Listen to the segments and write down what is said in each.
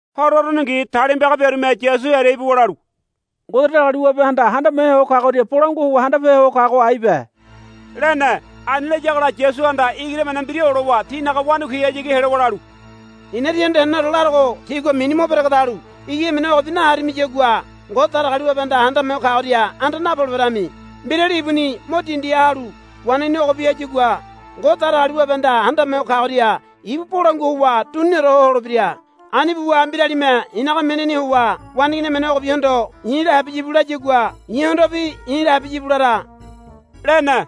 Horo uruningi talima piaga biarume Yasu hearia ibuwa lalu, Ngode Datagaliwabehanda Handame Ho Kagoria bolangua howa handape ho kago aibe, lene. Ani layagola Yasuhanda igiri emene mbira olowa tinaga wanakuihayagi helowa lalu, I̱na tíhondo heneneore larogo tígua mini mo beregedalu igiri emene ogobi naharimiyagua Ngode Datagaliwabehanda Handame Ho Kagoria anda napoleberami. Mbirali ibuni mo dindiha halu waneigini ogobi hayagua Ngode Datagaliwabehanda Handame Ho Kagoria ibu bolangua howa duniniore ho holebira. Ani buwa mbiralime i̱naga minini howa waneigini emene ogobigohondo, I̱la habiya íbu, layagua i̱hondobi i̱la habiya íbu lara, lene.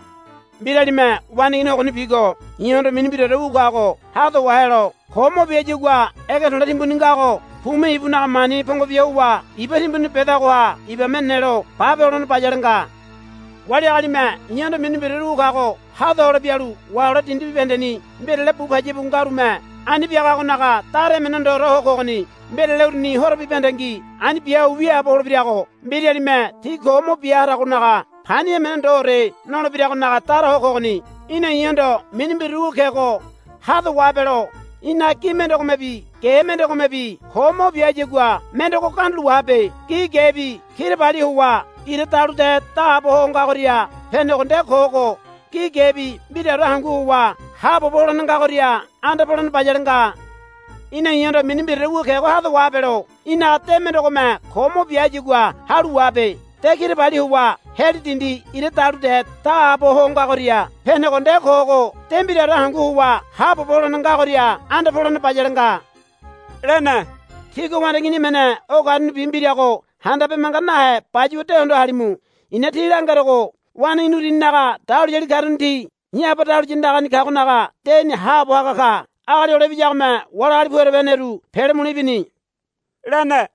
Mbiralime waneigini ogonibigo i̱hondo mini mbiraore wu kago hado wahelo ko mo bia hayagua ege to̱le̱ timbuni ngago pume ibunaga mani pongo bia howa iba timbuni bedagoha ibame nelo bape holene bayale nga. Wali agalime i̱hondo mini mbiraore wu kago hada hole bialu wahelo dindi bibahendeni mbirale bu payabu ngarume ani biagagonaga dara emene ndoore ho kogoni. Mbirale uruni horo bibahendengi ani bia ho wiaabo holebirago mbiralime ti ko mo bia haragonaga pani emene ndoore nolebiragonaga dara ho kogoni. Í̠na i̱hondo mini mbiraore wu kego hado wahabelo í̠naga gi mendegomebi ge mendegomebi ko mo bia hayagua mendego gandulo wahabe. Gi gebi kirabali howa ira dalude daabo ho ngagoria penego nde kogo gi gebi mbiraore hangu howa haabobo holene ngagoria anda polene bayale nga. Í̠na i̱hondo mini mbiraore wu kego hado wahabelo í̠naga de mendegome ko mo bia hayagua halu wahabe. De kirabali howa heli dindi ira dalude daabo ho ngagoria penego nde kogo de mbiraore hangu howa haabobo holene ngagoria anda polene bayale nga, lene. Tígua waneigini emene o karunibi mbirago handabe manga nahe bayuwa de hondo halimu. I̱na tí langerogo waneigini uruninaga dahuliyali karuni ti i̱ Aba dahuliya andagani kagonaga deni haabo haga ka. [ Agali Hole Ibiyagome wali agali pu ereba heneru pele mule ibini, lene.]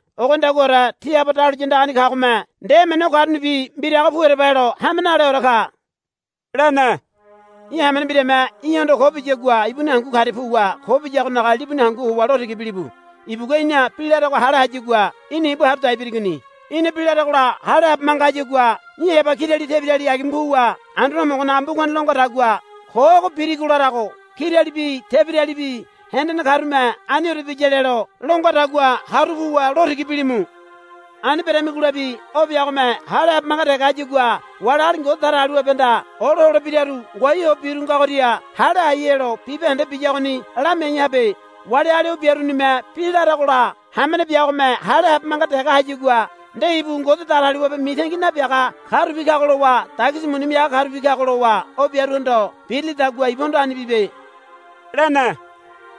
Ogonidaguaore tí Aba dahuliya andagani kagome nde emene o karunibi mbirago pu ereba helo hame naleore ka, lene. Í̠ hamene mbirame í̠hondo ko biyagua ibuni hangu karia puwa ko biyagonaga libuni hangu howa lo tiga bilibu. Ibugua í̠na bi larego hale hayagua í̠na ibu haru dai birigoni. Í̠na bi laregola hale habe manga hayagua í̠ heba kirali tebirali agima puwa Anduane Homogonaga mbugani lo ngadagua, Ko ogo birigo larago kiralibi tebiralibi hendene karume aniore biya lelo, lo ngadagua haru puwa lo tiga bilimu. Ani beramigolabi o biagome hale habe manga dege hayagua wali agali Ngode Datagaliwabehanda olo holebiraru ngoai ho biru ngagoria hale hai helo bibahende biyagoni lamiai habe. Wali agali o biarunime bi laragola hamene biagome hale habe manga dege hayagua nde ibu Ngode Datagaliwabe mitangi nabiaga karubi kago lowa dagisi muni miaga karubi kago lowa o biaruhondo birilidagua ibuhondo ani bibe, lene.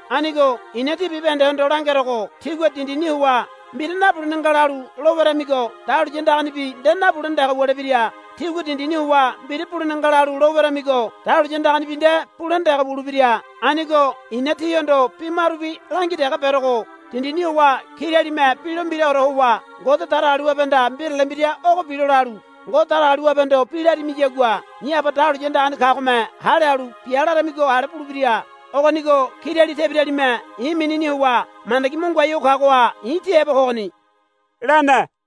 Anigo i̱na tí bibahendehondo langerogo tígua dindini howa mbira nabulene nga lalu lo weramigo dahuliya andaganibi nde nabulene dege wulebira. Tígua dindini howa mbira bulene nga lalu lo weramigo dahuliya andaganibi nde bulene dege wulebira. Anigo i̱na tíhondo bi marubi langi dege berogo. Dindini howa kiralime bi lo mbiraore howa Ngode Datagaliwabehanda mbirale mbira ogo bilo lalu Ngode Datagaliwabehondo bi larimiyagua i̱ Aba dahuliya andagani kagome hale halu bia laramigo ale bulebira. Ogonigo kirali tebiralime i̱ minini howa mandagi mo ngoai ho kagoha i̱ ti heba kogoni, lene.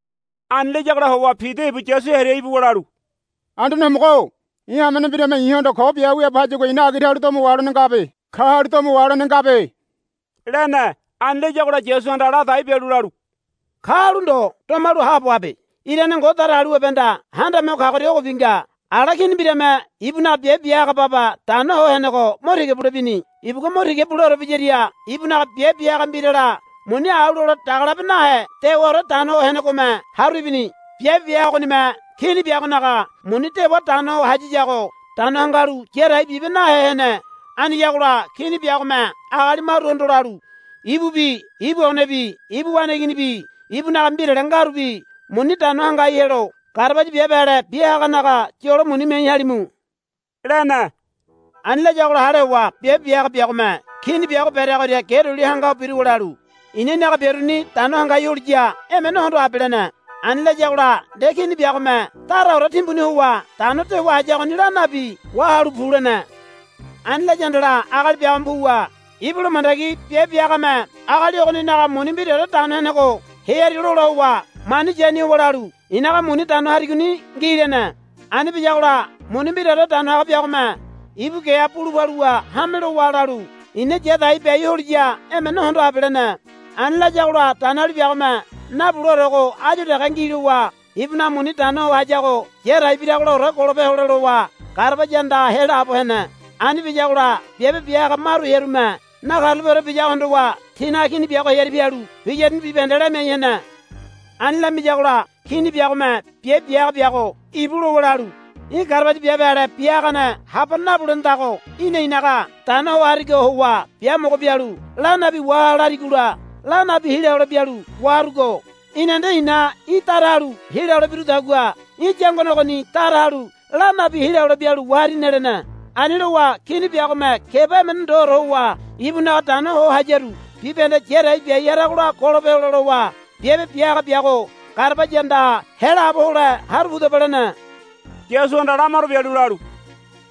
Ani layagola howa Pida ibu Yasu hearia ibuwa lalu, Anduane Homogo-o i̱ hamene mbirame i̱hondo ko bia ho wiaabo hayagua i̱na agira halu domo waholene ngabe. Ka halu domo waholene ngabe, lene. Ani layagola Yasuhanda ladai bialu lalu, Ka halu ndo. Domalu haabo habe. Irane Ngode Datagaliwabehanda Handame Ho Kagoria ogobi nga. Ala kini mbirame ibunaga biabe bia haga baba dano ho henego mo tiga bule bini. Ibugua mo tiga buleore biyaria ibunaga biabe bia haga mbirala muni au lole daga labe nahe dewaore dano ho henegome haru ibini. Biabe bia haga ogonime kini biagonaga muni dewa dano ho hayiyago dano hangalu ya dai bibe nahe hene. Aniyagola kini biagome agali maruhondo lalu, Ibubi ibu onebi ibu waneiginibi ibunaga mbirale ngarubi muni dano hangai helo garabaya biabe ale bia haganaga yolo muni miai halimu, lene. Ani layagola hale howa biabe bia haga biagome kini biago bereagoria ge duli hanga ho biruwa lalu, I̱na í̠naga biaruni dano hangai holiya emene hondo habe, lene. Ani layagola nde kini biagome daraore timbuni howa dano dewa hayagoni la nabi, Wahalu pu, lene. Ani laya handala agali biagome puwa ibula mandagi biabe bia hagame agali ogoninaga muni mbiraore dano henego hearia lola howa mani yani howa lalu, I̱naga muni dano harigoni ngi, lene. Ani biyagola muni mbiraore dano haga biagome ibu geha bulu paluwa hame lowa lalu, I̱na ya dai biai holiya emene hondo habe, lene. Ani layagola danoali biagome, Nabuleorego áyu dege ngi, lowa ibunaga muni dano ho hayago ya dai biragolaore golope hole lowa garabaya andaha helaabo hene. Ani biyagola biabe bia haga maru hearume nakarulapeore biyago hondowa tinaga kini biago hearia pialu biyaruni bibahende lamiai hene. Ani lamiyagola kini biagome biabe bia haga biago, Íbu, lowa lalu, Í̠ garabaya biabe ale bia hagane habane nabulenedago í̠na i̱naga dano ho harigo howa biamogo bialu la nabi waha larigola la nabi hila hole bialu waharugo. Í̠na nde i̱na í̠ dara halu hila hole birudagua í̠ yangone ogoni dara halu la nabi hila hole bialu waharine, lene. Ani lowa kini biagome keba emene ndoore howa ibunaga dano ho hayaru bibahende ya dai biai haragola golope hole lowa, Biabe bia haga biago garabaya andaha helaabo hole haru pudaba, lene. Yasuhanda la maro bialu lalu,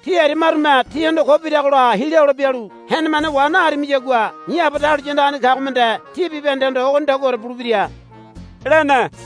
Tí aria marume tíhondo ko biragola hila hole bialu henemane wa naharimiyagua i̱ Aba dahuliya andagani kagome nde tí bibahendehondo ogonidaguaore bulebira, lene.